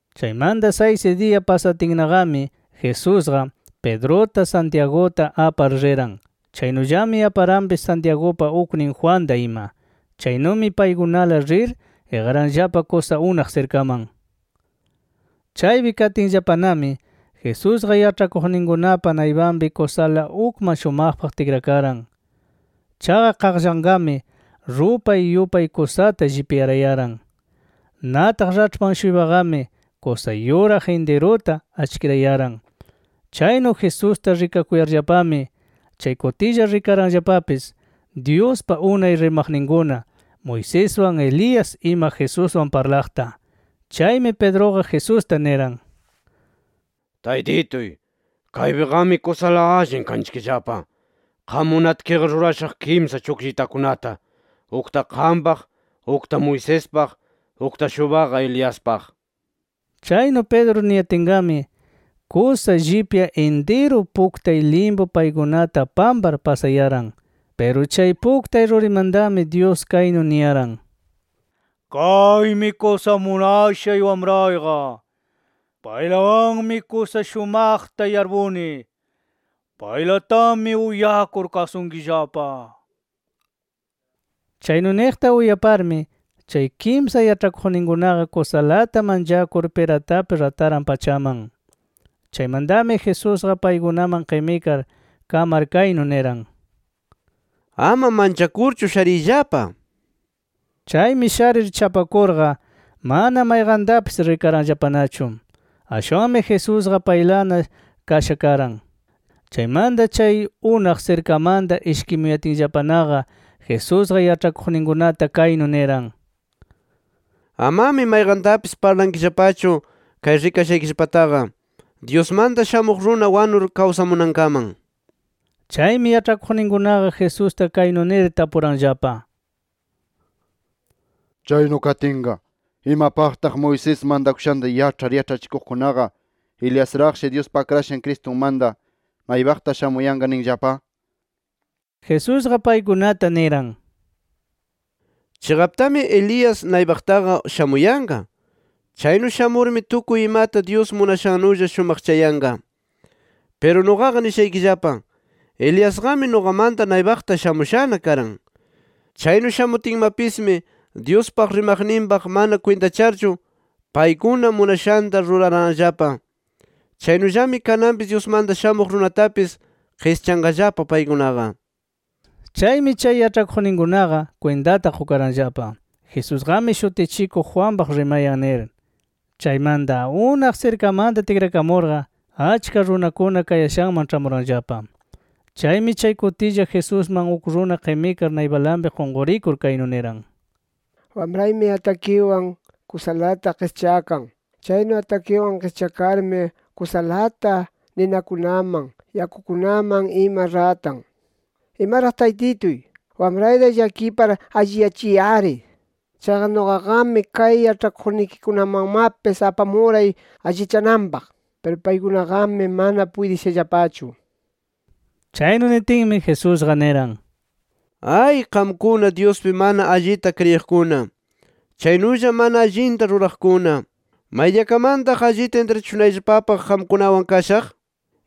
Chaymanta saysi diya pasatinnaqami Jesusqa, Pedruta Santiaguta apar riran. Chaynullami aparanpis Santiagupa uknin Juanta ima. Chaynumi paykunala rir iqaranllapa kusa unaq sirkaman. Chaypi katinllapanami, Jesusqa yaĉhakuqninkunapa naypanpi kusala ukman shumaqpaq tikrakaran. Chaqa qaqllanqami rupay yupay kusata llipyarayaran. Nataq raĉhpan-shuypaqami kusa yuraq intiruta achkirayaran. Chaynu Jesusta rikakuyarllapami, chay kutilla rikaranllapapis Dyuspa unay rimaqninkuna Moiseswan, Elías ima Jesuswan parlaqta. Chaymi Pedruqa Jesusta niran: —Taytituy ¡kaypiqami kusala allin kanchikllapa! Qam munatkiqa, rurashaq kimsa chukllitakunata, ukta qampaq, ukta Moisespaq, ukta-shuypaqa Eliaspaq nir. Chaynu Pedro niyatinqami, kusa llipya intiru puktay limpu paykunata pampar pasayaran. Piru chay puktay rurimantami Dyus kaynu niyaran: “Kaymi kusa munashay Wamrayqa. Paylawanmi kusa shumaqta yarpuni. ¡Paylatami uyakur kasunkillapa!” nir. Chaynu niqta uyaparmi chay kimsa yaĉhakuqninkunaqa kusalata manchakur piratap rataran pachaman. Chaymantami Jesusqa paykunaman qimikar, kamar kaynu niran: —Ama manchakurchu shariyllapa nir. Chaymi sharir chapakurqa mana mayqantapis rikaranllapanachu. Ashwanmi Jesusqa paylana kasha karan. Chaymanta chay unaq sirkamanta ishkimuyatinllapanaqa Jesusqa yaĉhakuqninkunata kaynu niran: —Amami mayqantapis parlankillapachu chay rikashaykillapataqa, Dyusmanta Shamuq Runa wanur kawsamunankaman nir. Chaymi yaĉhakuqninkunaqa Jesusta kaynu nir tapuranllapa: —Chaynu katinqa, ¿imapaqtaq Moisés mantakushanta yaĉhar yaĉhachikuqkunaqa, Eliasraqshi Dyuspa Akrashan Cristunmanta naypaqta shamuyanqa ninllapa? nir. Jesusqa paykunata niran: —Chiqaptami Elías naypaqtaqa shamuyanqa. Chaynu shamurmi tukuy imata Dyus munashanulla shumaqchayanqa. Piru nuqaqa nishaykillapa: Eliasqami nuqamanta naypaqta shamushana karan. Chaynu shamutinmapismi, Dyuspa rimaqninpaq mana kwintacharchu paykuna munashanta ruraranllapa. Chaynullami kananpis Dyusmanta Shamuq Runatapis qischanqallapa paykunaqa. Chaymi chay yaĉhakuqninkunaqa kwintata qukaranllapa, Jesusqami Shutichikuq Juanpaq rimayan nir. Chaymanta, unaq sirkamanta tikrakamurqa achka runakuna kayashanman ĉhamuranllapa. Chaymi chay kutilla, Jesusman uk runa qimikar naypalanpi qunqurikur, kaynu niran: —Wamraymi atakiwan kusalata qischakan. Chaynu atakiwan qischakarmi kusalata ninakunaman, yakukunaman ima ratan. ¡Imaraq Taytituy, wamrayta llakipar alliyachiy-ari! Chaqa nuqaqami kay yaĉhakuqnikikunamanmapis apamuray allichananpaq. Piru paykunaqami mana puytishallapachu nir. Chaynu nitinmi, Jesusqa niran: —¡Ay qamkuna Dyuspi mana allita kriyiqkuna, chaynulla mana allinta ruraqkuna! ¿Maydiyakamantaq allita intrachishunayllapapaq qamkunawan kashaq?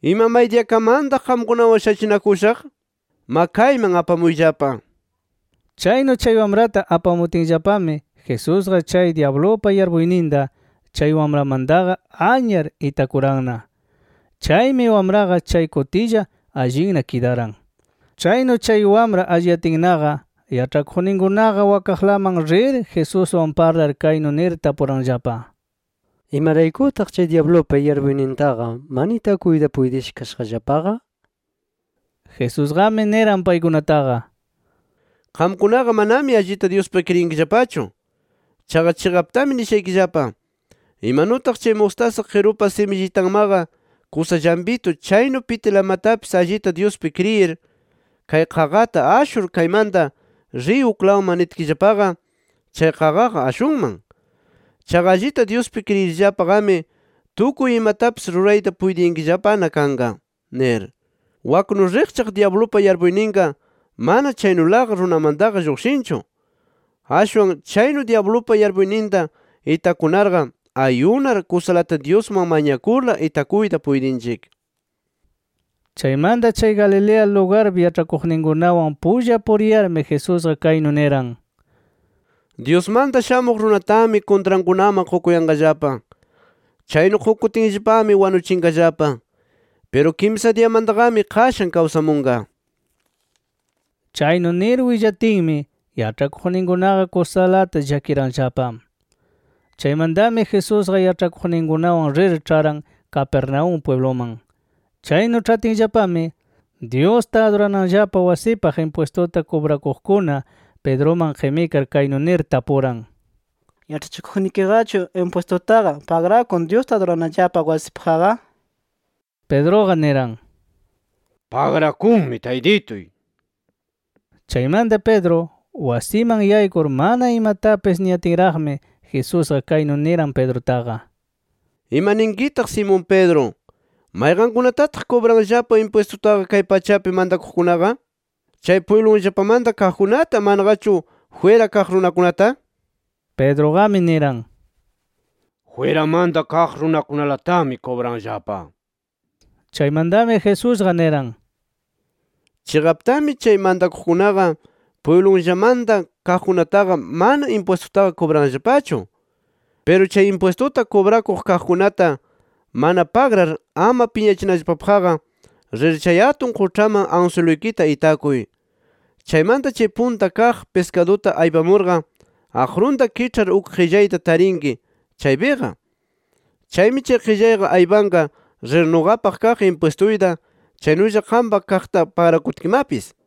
¿Ima maydiyakamantaq qamkunawan shachinakushaq? Ma, kayman apamuyllapa nir. Chaynu chay wamrata apamutinllapami Jesusqa chay dyablupa yarpuyninta chay wamramantaqa anyar itakuranna. Chaymi wamraqa chay kutilla, allinna kidaran. Chaynu chay wamra alliyatinnaqa, yaĉhakuqninkunaqa wakaqlaman rir Jesuswan parlar, kaynu nir tapuranllapa: —¿Imaraykutaq chay dyablupa yarpuynintaqa mana itakuyta puytisha kashaqllapaqa? nir. Jesusqami niran paykunataqa: —Qamkunaqa manami allita Dyuspiqa kriyinkillapachu. Chaqa chiqaptami nishaykillapa: Imanutaq chay mustasa qirupa simillitanmaqa kusa llampitu chaynu pitilamatapis allita Dyuspi kriyir, kay qaqata ‘Ashur kaymanta, riy uklawman’ nitkillapaqa, chay qaqaqa ashunman. Chaqa allita Dyuspi kriyirllapaqami tukuy imatapis rurayta puytiyankillapana kanqa nir. [Waknu riqchaq dyablupa yarpuyninqa mana chaynulaqa runamantaqa lluqshinchu. Ashwan chaynu dyablupa yarpuyninta itakunarqa ayunar kusalata Dyusman mañakurla itakuyta puytinchik.] Chaymanta chay Galilea lugarpi yaĉhakuqninkunawan pulla puriyarmi, Jesusqa kaynu niran: “Dyusmanta Shamuq Runatami kuntrankunaman qukuyanqallapa. Chaynu qukutinllapami wanuchinqallapa. Piru kimsa diyamantaqami, qashan kawsamunqa”. Chaynu nir willatinmi, yaĉhakuqninkunaqa kusalata llakiranllapa. Chaymantami Jesusqa yaĉhakuqninkunawan rir ĉharan Capernaúm pwibluman. Chaynu ĉhatinllapami, Dyusta adurananllapa wasipaq impwistuta kubrakuqkuna Pedruman qimikar, kaynu nir tapuran: —¿Yaĉhachikuqnikiqachu impwistutaqa pagrakun Dyusta adurananllapa wasipaqqa? nir. Pedruqa niran: —Pagrakunmi taytituy. Chaymanta Pedro wasiman yaykur mana imatapis niyatinraqmi, Jesusqa kaynu niran Pedrutaqa: —Ima ninkitaq Simón Pedro, ¿mayqankunatataq kubranllapa impwistutaqa kay pachapi mantakuqkunaqa? ¿Chay pwiblunllapamanta kaqkunata, manaqachu jwira kaq runakunata? nir. Pedruqami niran: —Jwiramanta kaq runakunalatami kubranllapa nir. Chaymantami Jesusqa niran: —Chiqaptami, chay mantakuqkunaqa pwiblunllamanta kaqkunataqa mana impwistutaqa kubranllapachu. Piru chay impwistuta kubrakuq kaqkunata mana pagrar ama piñachinallapapaqqa, rir chay atun quĉhaman answiluykita itakuy. Chaymanta chay punta kaq piskaduta aypamurqa, aqrunta kiĉhar uk qillayta tarinki chaypiqa. Chaymi chay qillayqa aypanqa, rir nuqapaq kaq impwistuyta chaynulla qampa kaqta pagrakutkimapis nir.